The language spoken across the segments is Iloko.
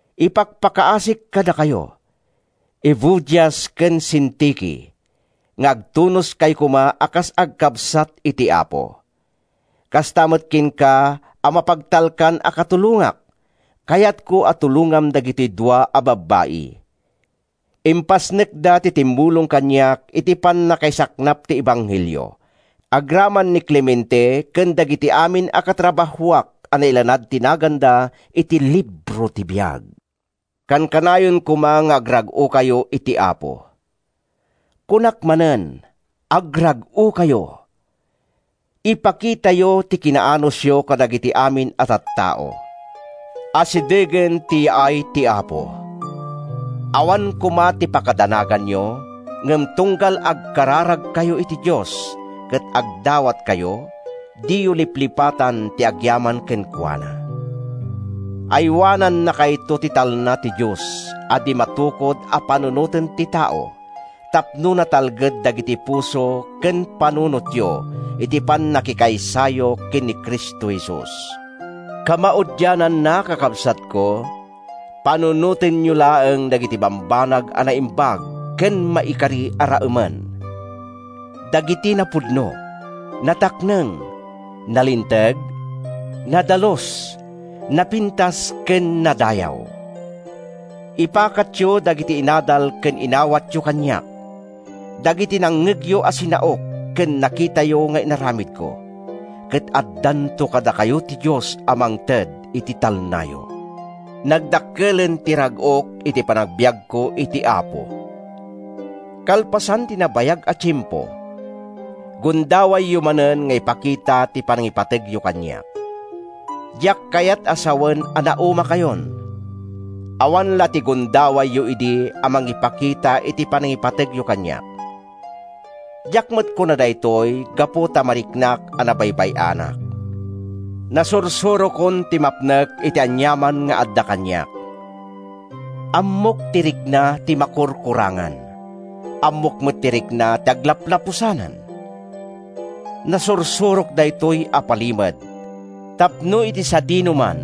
Ipakpakaasik kadakayo, Evodias ken Sintike, nga agtunoskayo koma a kas agkabsat iti Apo. Kasta met kenka a mapagtalkan a katulongak, kayatko a tulongam dagitoy dua a babbai. Impasnekda ti timmulong kaniak iti pannakaisaknap ti ebanghelio, agraman ni Clemente ken dagiti amin a katrabahoak a nailanad ti naganda iti libro ti biag. Kankanayon koma nga agrag-okayo iti Apo. Kunak manen: agrag-okayo! Ipakitayo ti kinaanusyo kadagiti amin a tattao. Asidegen ti yaay ti Apo. Awan koma ti pakadanaganyo, ngem tunggal agkararagkayo iti Dios ket agdawatkayo, diyo liplipatan ti agyaman kenkuana. Aywanannakayto ti talna ti Dios a di matukod a panunoten ti tao tapno natalged dagiti puso ken panunotyo iti pannakikaysayo ken ni Cristo Jesus. Kamaudiananna, kakabsatko, panunotenyo laeng dagiti bambanag a naimbag ken maikari a raemen: dagiti napudno, natakneng, nalinteg, nadalus, napintas, ken nadayaw. Ipakatyo dagiti inadal ken inawatyo kaniak—dagiti nangngegyo a sinaok ken nakitayo nga inaramidko—ket addanto kadakayo ti Dios a mangted iti talnayo. Nagdakkelen ti rag-ok iti panagbiagko iti Apo! Kalpasan ti nabayag a tiempo, gundawayyo manen nga ipakita ti panangipategyo kaniak. Diak kayat a sawen a naumakayon. Awan la ti gundawayyo idi a mangipakita iti panangipategyo kaniak. Diak met kuna daytoy gapu ta mariknak a nabaybay-anak. Nasursurokon ti mapnek iti aniaman nga adda kaniak. Ammok ti rikna ti makurkurangan. Ammok met ti rikna ti aglaplapusanan. Nasursurok daytoy a palimed, tapno iti sadinoman,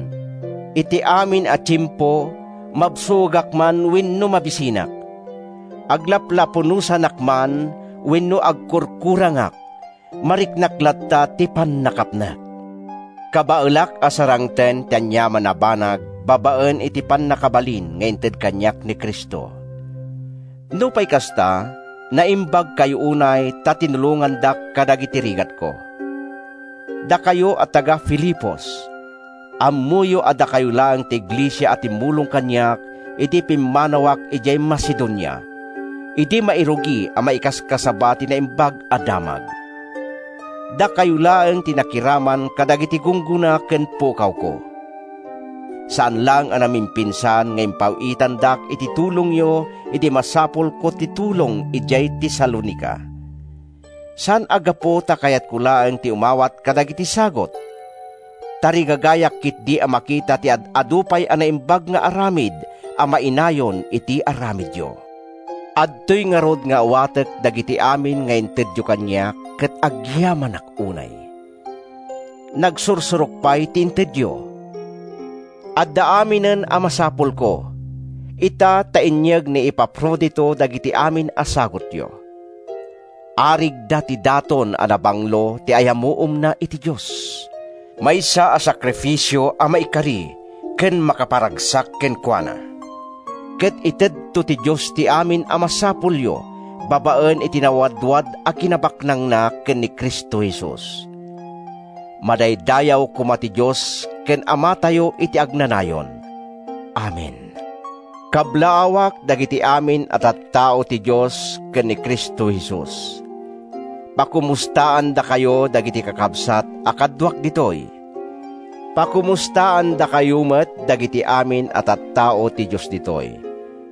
iti amin a tiempo, mabsogak man wenno mabisinak, aglaplapunosanak man wenno agkurkurangak, mariknak latta ti pannakapnek. Kabaelak a sarangten ti aniaman a banag babaen iti pannakabalin nga ited kaniak ni Cristo. Nupay kasta, naimbagkayo unay ta tinulongandak kadagiti rigatko. Dakayo a taga-Filipos, ammoyo a dakayo laeng ti iglesia a timmulong kaniak idi pimmanawak idiay Macedonia, idi mairugi a maikaskasaba ti Naimbag a Damag. Dakayo laeng ti nakiraman kadagiti gunggona ken pukawko. Saan laeng a namimpinsan nga impaw-itandak iti tulongyo idi masapulko ti tulong idiay Tesalonica. Saan a gapu ta kayatko laeng ti umawat kadagiti sagut; tarigagayak ketdi a makita ti ad-adu pay a naimbag nga aramid a mainayon iti aramidyo. Adtoy ngarud nga awatek dagiti amin nga intedyo kaniak, ket agyamanak unay. Nagsursurok pay ti intedyo. Adda aminen a masapulko, ita ta inyeg ni Epafrodito dagiti amin a sagutyo. Arigda ti daton a nabanglo ti ayamuomna iti Dios, maysa a sakrifisio a maikari ken makaparagsak kenkuana. Ket itedto ti Diosko ti amin a masapulyo babaen iti nawadwad a kinabaknangna ken Cristo Jesus. Madaydayaw koma ti Dios ken Amatayo iti agnanayon. Amen. Kablaawak dagiti amin a tattao ti Dios ken ni Cristo Jesus. Pakomustaandakayo dagiti kakabsat a kaduak ditoy. Pakomustaandakayo met dagiti amin a tattao ti Dios ditoy,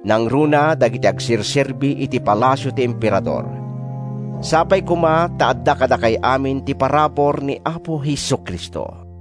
nangruna dagiti agserserbi iti palasio ti Emperador. Sapay koma ta adda kadakay amin ti parabur ni Apo Jesu-Cristo.